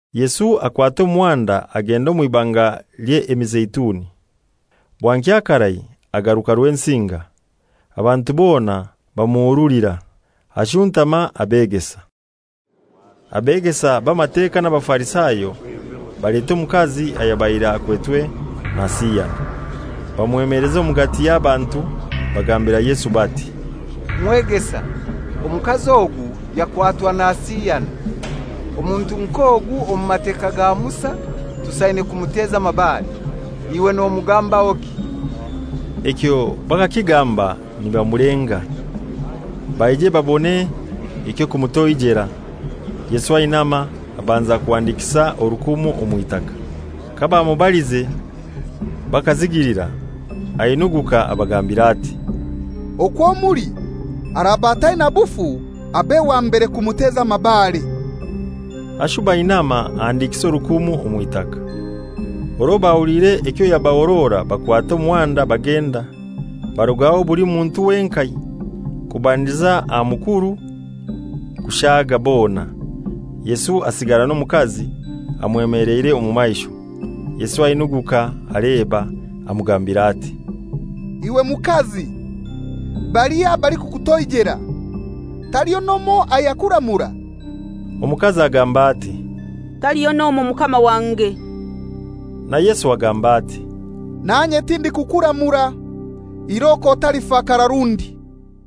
Yesu akwata omuhanda agenda omw'Ibanga ly'Emizeituni. Bwankya karai agaruka Rwensinga; abantu bona bamuhurulira, ashuntama abeegesa. Abeegesa b'Amateka n'Abafarisayo baleta omukazi ayabaire akwetwe nasiyana, bamwemeleza omugati y'abantu bagambira Yesu bati, «Mwegesa, omukazi ogu yakwatwa nasiyana. Omuntu nk'ogu omu Mateka ga Musa tusaine kumuteza amabare. Iwe nomugambahoki?» Ekyo bakakigamba nibamulenga, baije babone eky'okumutoijera. Yesu ainama abanza kuhandikisa orukumu omw'itaka. Kabamubalize bakazigilira, ainuguka abagambira ati, «Okwo muli araba ataina bufu abe wa mbere kumuteza amabare.» Ashuba ainama ahandikisa orukumu omw'itaka. Orwo bahuliire ekyo yabahorora bakwata omuhanda bagenda, barugaho buli muntu wenkai, kubandiza aha mukuru kushaaga bona, Yesu asigara n'omukazi amwemeleire omu maisho. Yesu ainuguka aleba, amugambira ati, «Iwe mukazi, balihai abalikukutoijera? Taliho n'omoi ayakuramura?» Omukazi agamba ati, «Taliho n'omoi Mukama wange.» Na Yesu agamba ati, «Nanye tindikukuramura. Iroko otalifakara rundi.»]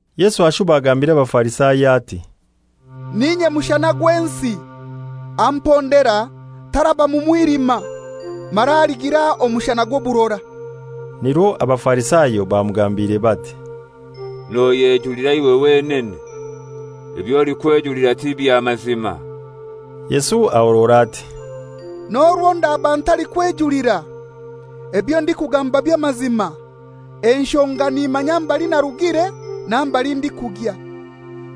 Yesu ashuba agambira Abafarisayo ati, «N'inye mushana gw'ensi. Ampondera taraba mu mwilima, mara aligira omushana gw'oburora.» Nirwo Abafarisayo bamugambire bati, «Noyejulira iwe wenene; eby'olikwejulira tibya mazima.» Yesu ahorora ati, «N'orwo ndaba ntalikwejulira, ebyo ndikugamba by'amazima, enshonga nimanya mbali narugire na mbali ndikugya.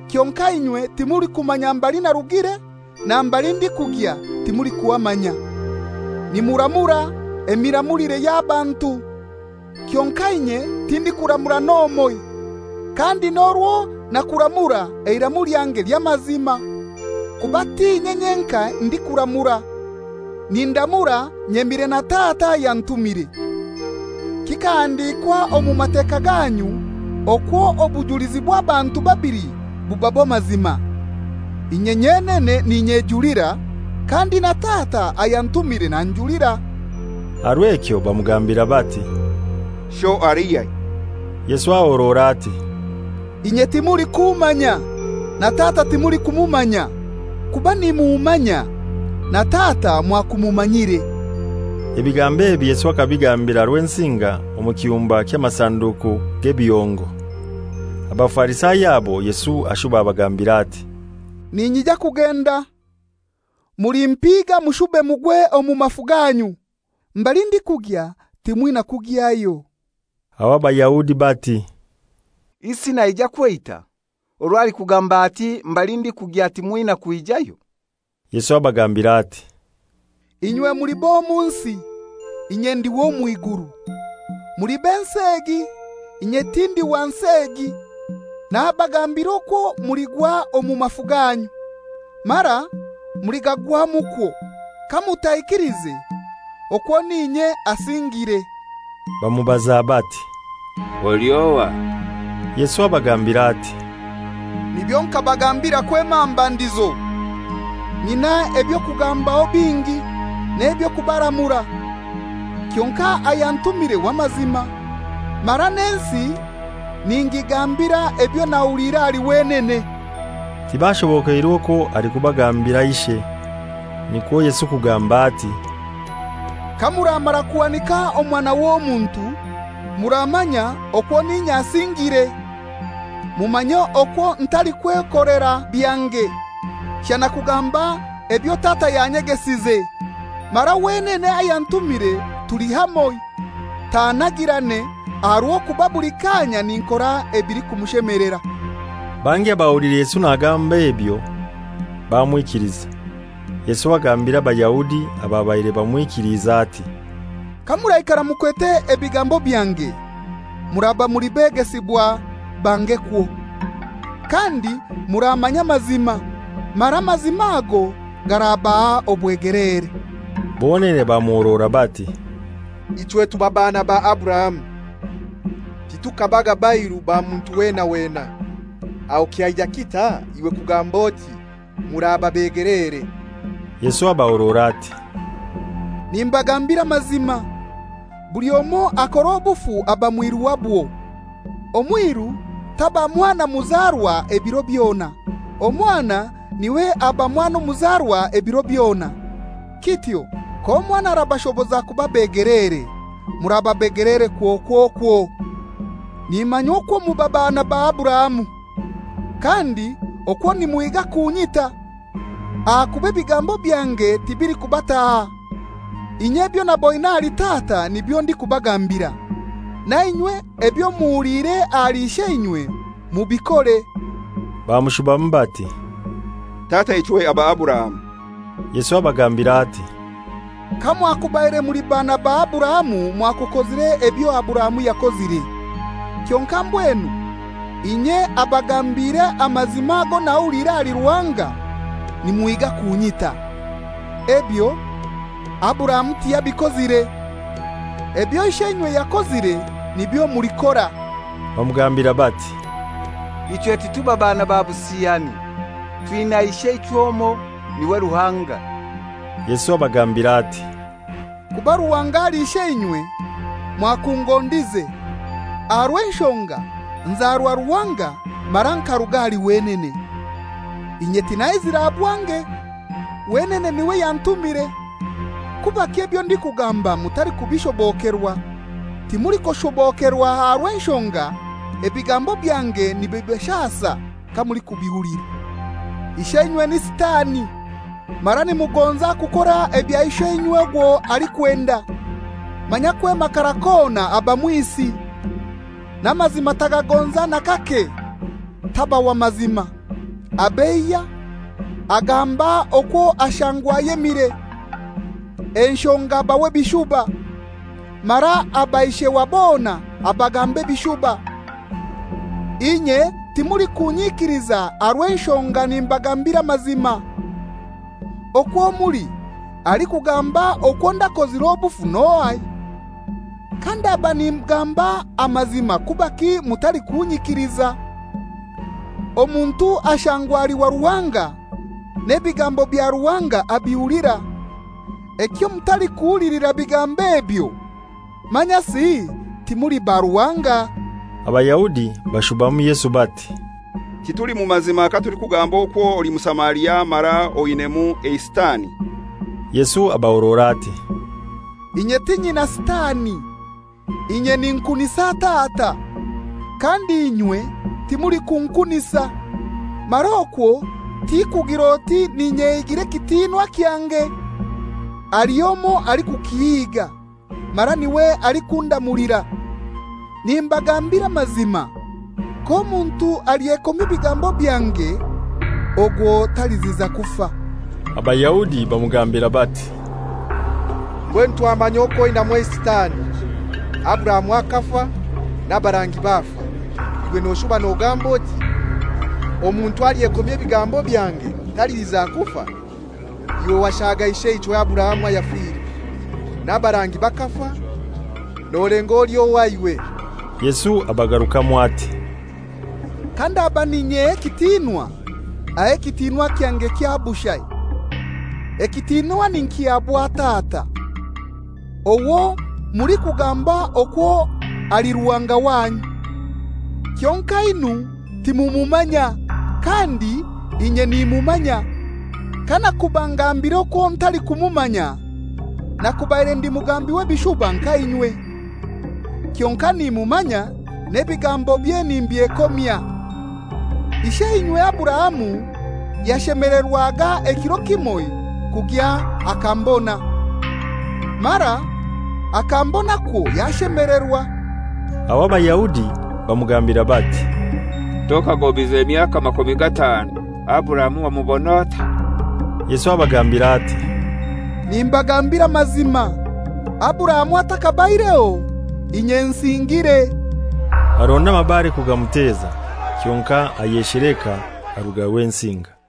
Kyonkai inywe timulikumanya mbali narugire, na mbali ndikugya timulikuhamanya. Nimuramura emiramulire ey'abantu, kyonkai inye tindikuramura n'omoi. Kandi n'orwo nakuramura, eiramu lyange ly'amazima, kuba t'inye nyenkai ndikuramura. Nindamura nyemire na Tata ayantumire. Kikahandikwa omu Mateka ganyu okwo obujulizi bw'abantu babili buba bw'amazima. Inye nyenene n'inyejulira, kandi na Tata ayantumire nanjulira.» Aha rw'ekyo bamugambira bati, «Sho alihai?» Yesu ahorora ati, «Inye timulikummanya, na Tata timulikumumanya. Kuba nimummanya, na Tata mwakumumanyire.» Ebigambo ebi Yesu akabigambira Rwensinga omu kiyumba ky'amasanduku g'ebihongo. Abafarisayo abo Yesu ashuba abagambira ati, «Ninyija kugenda, mulimpiga mushube mugwe omu mafu ganyu. Mbali ndikugya timwina kugyayo.» Aho Abayahudi bati, «Isi naija kweita, orwo alikugamba ati, ‹Mbali ndikugya timwina kwijayo?›» Yesu abagambira ati, «Inywe muli b'omu nsi, inye ndi w'omw'iguru. Muli b'ensi egi, inye tindi wa nsi egi. Nabagambira okwo muligwa omu mafu ganyu, mara muligagwamukwo kamutaikiliize okwo n'inye asingiire.» Bamubaza bati, «Oli ohai?» Yesu abagambira ati, «Nibyo nkabagambira kwema aha mbandizo. Nyinai eby'okubagambaho bingi n'eby'okubaramura. Kyonkai ayantumire w'amazima, mara n'ensi ningigambira ebyo nahuliire ahali wenene.» Tibashobokeirwe okwo alikubagambira Ishe. Nikwo Yesu kugamba ati, «Kamuramara kuhanika Omwana w'Omuntu, muramanya okwo n'inye asingiire, mumanye okwo ntalikwekolera byange, shana okugamba ebyo Tata yanyegesize. Mara wenene ayantumire tuli hamoi, tannagirane, aha rw'okuba buli kaanya ninkora ebilikumushemelera.» Bangi abahuliire Yesu nagamba ebyo, bamwikiliza. Yesu agambira Abayahudi ababaire bamwikiliize ati, «Kamuraikara mukwete ebigambo byange, muraba muli begesibwa bangekwo, kandi muramanya amazima, mara amazima ago garabaha obwegeleere.» Bonene bamuhorora bati, «Ichwe tuba baana ba Aburahamu, titukabaga bairu ba muntu wena wena. Aho kyaija kitai iwe kugamb'oti, ‹Muraba begeleere?›» Yesu abahorora ati, «Nimbagambira amazima, buli omoi akora obufu aba mwiru wabwo. Omwiru taba mwana muzarwa ebiro byona; omwana n'iwe aba mwana muzarwa ebiro byona. Kityo k'Omwana arabashoboza kuba begeleere, muraba begeleere kwokwokwo. Nimanya okwo muba baana ba Aburahamu. Kandi okwo nimuhiga kunyita, ahakuba ebigambo byange tibilikubataha. Inye ebyo naboine ahali Tata nibyo ndikubagambira, nainywe ebyo muhuliire ahali isheinywe mubikore.» Bamushubamu bati, «Tataichwe aba Aburahamu.» Yesu abagambira ati, «Kamwakubaire muli baana ba Aburahamu mwakukozire ebyo Aburahamu yakozire. Kyonkai mbwenu inye abagambiire amazima ago nahuliire ahali Ruhanga, nimuhiga kunyita. Ebyo Aburahamu tiyabikozire. Ebyo isheinywe yakozire nibyo mulikora.» Bamugambira bati, «Ichwe tituba baana ba busiyani; twinai Isheichwe omoi, n'iwe Ruhanga.» Yesu abagambira ati, «Kuba Ruhanga ali Isheinywe, mwakungondize, aha rw'enshonga nzarwa Ruhanga mara nkaruga ahali wenene. Inye tinaizire aha bwange, wenene n'iwe yantumire. Kubaki ebyo ndikugamba mutalikubishobokerwa? Timulikushobokerwa aha rw'enshonga ebigambo byange nibibashasa kamulikubihulira. Isheinywe ni Sitani, mara nimugonza kukora ebyo isheinywe ogwo alikwenda. Manya kwema akarai kona aba mwisi, n'amazima tagagonza n'akake, taba wa mazima. Abeiya, agamba okwo ashangwa ayemire, enshonga aba w'ebishuba, mara aba ishe wa bona abagamba ebishuba. Inye timulikunyikiliza aha rw'enshonga nimbagambira amazima. Okwo muli alikungamba okwo ndakozire obufu n'ohai? Kandaba ningamba amazima kubaki mutalikunyikiliza? Omuntu ashangwa ali wa Ruhanga, n'ebigambo bya Ruhanga abihulira. Ekyo mutalikuhulilira bigambo ebyo manyasi timuli ba Ruhanga.» Abayahudi bashubamu Yesu bati, «Tituli mu mazima katulikugamba okwo oli Musamaria mara oinaimu eisitani?» Yesu abahorora ati, «Inye tinyina sitani; inye ninkunisa Tata, kandi inywe timulikunkunisa. Mara okwo tikugir'oti n'inyehigira ekitinwa ekyange; haliho omoi alikukihiga, mara n'iwe alikundamulira. Nimbagambira amazima, k'omuntu alyekomya ebigambo byange, ogwo taliziza kufa.» Abayahudi bamugambira bati, «Mbwenu twamanya okwo oinaimu eisitani. Aburahamu akafa, n'abarangi bafa; iwe noshuba nogamba oti, ‹Omuntu alyekomya ebigambo byange taliziza kufa?› Iwe washaga isheichwe Aburahamu ayafire? N'abarangi bakafa! Nolenga oli ohai iwe?» Yesu abagarukamu ati, «Kandaba n'inyeha ekitinwa, aho ekitinwa kyange kya bushai. Ekitinwa ninkihabwa Tata, owo mulikugamba okwo ali Ruhanga wanyu. Kyonkainu timumumanya; kandi inye nimummanya. Kanakuba ngambire okwo ntalikumumanya, nakubaire ndi mugambi w'ebishuba nka inywe. Kyonkai nimumanya n'ebigambobye nimbyekomya. Isheinywe Aburahamu yashemelerwaga ekiro kimoi kugya akambona; mara akambonakwo yashemelerwa.» Aho Abayahudi bamugambira bati, «Tokagobize myaka makumi gatanu, Aburahamu wamubon'otai?» Yesu abagambira ati, «Nimbagambira amazima, Aburahamu athakabaireho, inye nsingiire.» Baronda amabare kugamuteza, kyonkai ayesheleka, aruga Rwensinga.